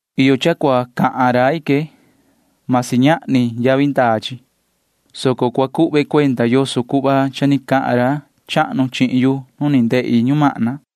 Iyo cha cua cahan rai que. Masi ñahni yavi ndaa chi, soco cua cuhve cuenda yoso cuhva cha ni cahan ra chahnu chihin yu nu ni ndehi ñumahna.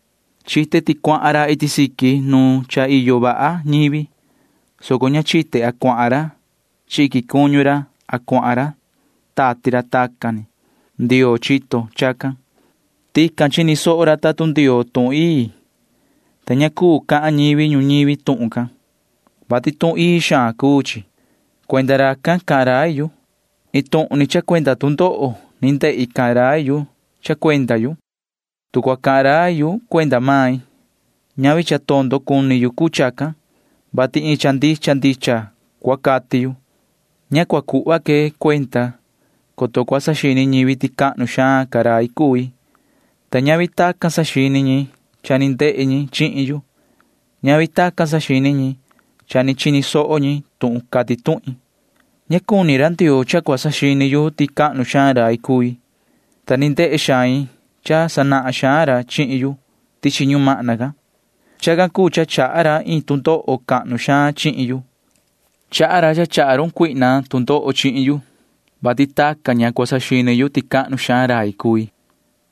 Chite ti cuahan ra iti siqui nu cha iyo vaha ñivi, soco ña chite a cuahan ra chi iquin cuñu ra a cuahan tati ra tacan ni. Ndioo chito chacan. Tican chini soho ra tuhun Ndioo tuhun ii, ta ña cuu cahan ñivi ñuñivi tuhun can, [vati tuhun ii xaan cuu chi]. Cuenda racan cahan rai yu. Iin tuhun ni cha cuenda tu ndoho ni ndehi cahan rai yu cha cuenda yu. Tu cua cahan rai yu cuenda main, ñavi cha tondo cuni yu cuu chacan, vati iin cha ndicha ndicha cua cati yu. Ña cua cuhva que cuenda, coto cua saxini ñivi ti cahnu xaan ca rai cui, ta ñavi tacan saxini ñi cha ni ndehe ñi chihin yu. Ñavi tacan saxini ñi cha ni chini soho ñi tuhun cati tuhin. Ña cuni ra Ndioo cha cua saxini yu ti cahnu xaan rai cui, ta ni ndehe xain cha sanahan xaan ra chihin yu tichi ñumahna can. Chacan cuu cha chaha ra iin tu ndoho cahnu xaan chihin yu. Chaha ra cha chaha run Satanaa tu ndoho chihin yu, vati tacan ña cua saxini yu ti cahnu xaan rai cui.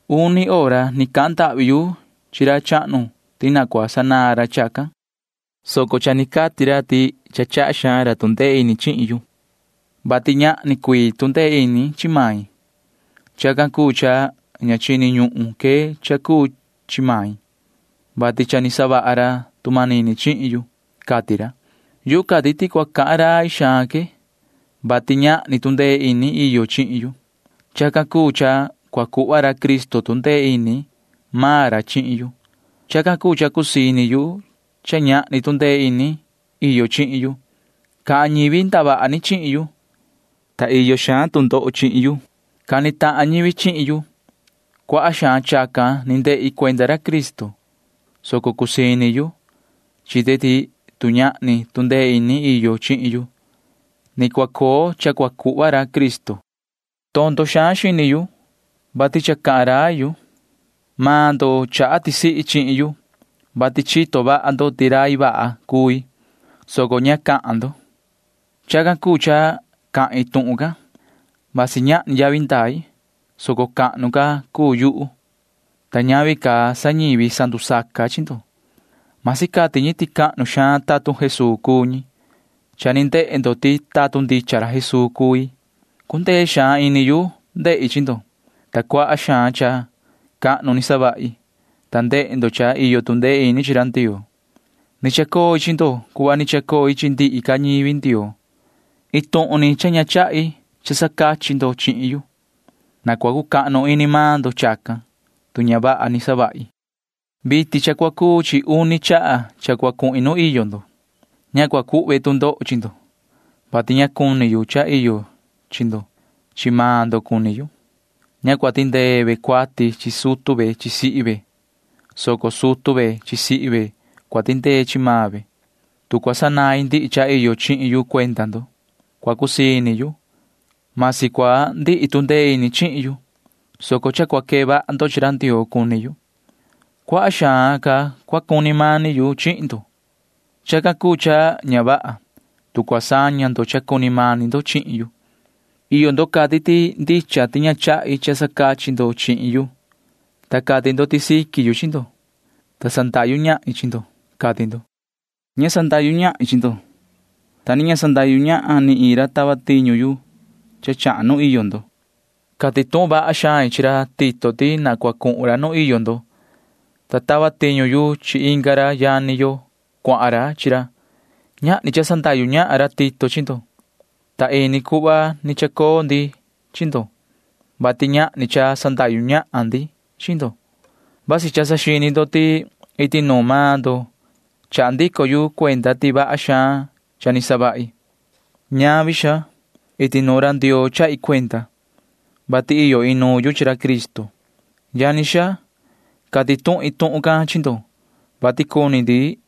Uni hora ni cahan ndahvi yu chi ra chahnu ti na cua sanaan ra chacan, soco cha ni cati ra ti cha chaha xaan ra tu ndee ini chihin yu, vati ñahni cuii tu ndee ini chi main. Chacan cuu cha ña chini ñuhun que cha cuu chi main, vati cha ni savaha ra tu manini chihin yu, cati ra. Yuhu cati ti cua cahan rai xaan que, vati ñahni tu ndee ini iyo chihin yu. Chacan cuu cha cua cuhva ra Cristo tu ndee ini maan ra chihin yu. Chacan cuu cha cusii ini yu cha ñahni tu ndee ini iyo chihin yu. Cahan ñivi ndavaha ni chihin yu, ta iyo xaan tu ndoho chihin yu. Cani tahan ñivi chihin yu. Cuaha xaan chacan ni ndehi cuenda ra Cristo, soco cusii ini yu. Chite ti tu ñahni tu ndee ini iyo chihin yu, ni cua coo cha cua cuhva ra Cristo. Tondo xaan xini yu, vati cha cahan rai yu. Maan ndo chaha tisihi chihin yu, vati chito vaha ndo ti rai vaha cui, soco ña cahan ndo. Chacan cuu cha cahin tuhun can. Vasi ñahni yavi ndai, soco cahnu ca cuu yuhu, ta ñavi ca sa ñivi sandusaca chi ndo―masi cati ñi ti cahnu xaan tatun Jesuu cuu ñi. Cha ni ndehe ndo ti tatun ndicha ra Jesuu cui. Cundee xaan ini yu ndehi chi ndo, ta cuaha xaan cha cahnu ni savahi, ta ndehe ndo cha iyo tu ndee ini chi ra Ndioo. Ni chacoi chi ndo cuhva ni chacoi chi ndihi ca ñivi Ndioo. Iin tuhun ni cha ña chahi cha sacachi ndo chihin yu. Na cua cucahnu ini maan ndo chacan, tu ña vaha ni savahi. Vitin cha cua cuu chi uni chaha cha cua cuhin nu iyo ndo. Ña cua cuhve tu ndoho chi ndo, vati ña cuni yu cha iyo chi ndo. Chi maan ndo cuni yu. Ña cua tindee ve cuati chi sutu ve chi sihi ve, soco sutu ve chi sihi ve cua tindee chi maan ve. Tu cua sanain ndihi cha iyo chihin yu cuenda ndo, cua cusii ini yu. Masi cua ndihi tu ndee ini chihin yu, soco cha cua quee vaha ndo chi ra Ndioo cuni yu. Cuaha xaan ca cua cuni mani yu chihin ndo. Chacan cuu cha ña vaha, tu cua saña ndo cha cuni mani ndo chihin yu. Iyo ndo cati ti ndicha ti ña chahi cha sacachi ndo chihin yu, ta cati ndo ti siqui yu chi ndo, ta sandahyu ñahin chi ndo, cati ndo. Ña sandahyu ñahin chi ndo, ta ni ña sandahyu ñahan ni iin ra tava tiñu yu chahan nu iyo ndo. Cati tuhun vaha xain chi ra Tito ti na cua cuhun ra nu iyo ndo, ta tava tiñu yu chi inga ra yani yo cuahan ra chi ra. Ñahni cha sandahyu ñahan ra Tito chi ndo, ta ini cuhva ni chacoo ndi chi ndo, vati ñahni cha sandahyu ñahan ndi chi ndo. Vasi cha saxini ndo ti iti nuun maan ndo chaha ndico yu cuenda ti vaha xaan cha ni savahi. Ñavi, xaa. Iti nuun ra Ndioo chahi cuenda, vati iyo inuun yu chi ra Cristo. Yani xaa, cati tuhin tuhun can chi ndo, vati cuni ndi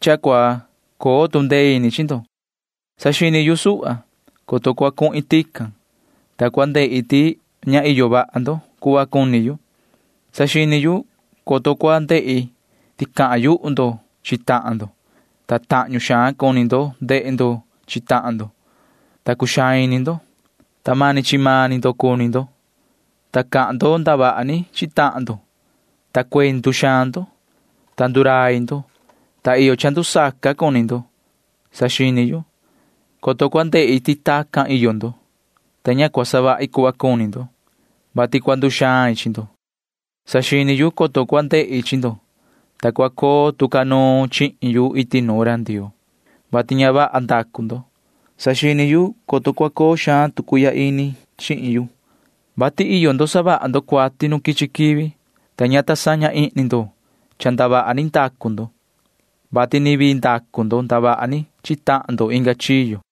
cha cua coo ca tu ndee ini chi ndo. Saxini yu suhva, coto cua cuhin tican, ta cua ndehi ti ña iyo vaha ndo cuhva cuni yu. Saxini yu, coto cua ndehi ti cahan yuhu ndo chi tahan ndo, ta tahñu xaan cuni ndo ndehe ndo chi tahan ndo, ta cuxaan ini ndo, ta mani chi maan ni ndo cuni ndo, ta cahan ndo ndavaha ni chi tahan ndo, ta cuendu xaan ndo, ta ndurai ndo, ta iyo cha ndusaca cuni ndo. Saxini yu, coto cua ndehi ti tacan iyo ndo, ta ña cua savahi cuhva cuni ndo, [vati cua nduxain chi ndo]. Saxini yu, coto cua ndehi chi ndo, ta cua coo tu ca nuun chihin yu iti nuun ra Ndioo, vati ña vaha ndacu ndo. Saxini yu, coto cua coo xaan tu cuihya ini chihin yu, vati iyo ndo savaha ndo cuati nu quichi quivi, ta ña ta saña ihni ndo cha ndavaha ni ndacu ndo, vati ni vii ndacu ndo ndavaha ni chi tahan ndo inga chiyo.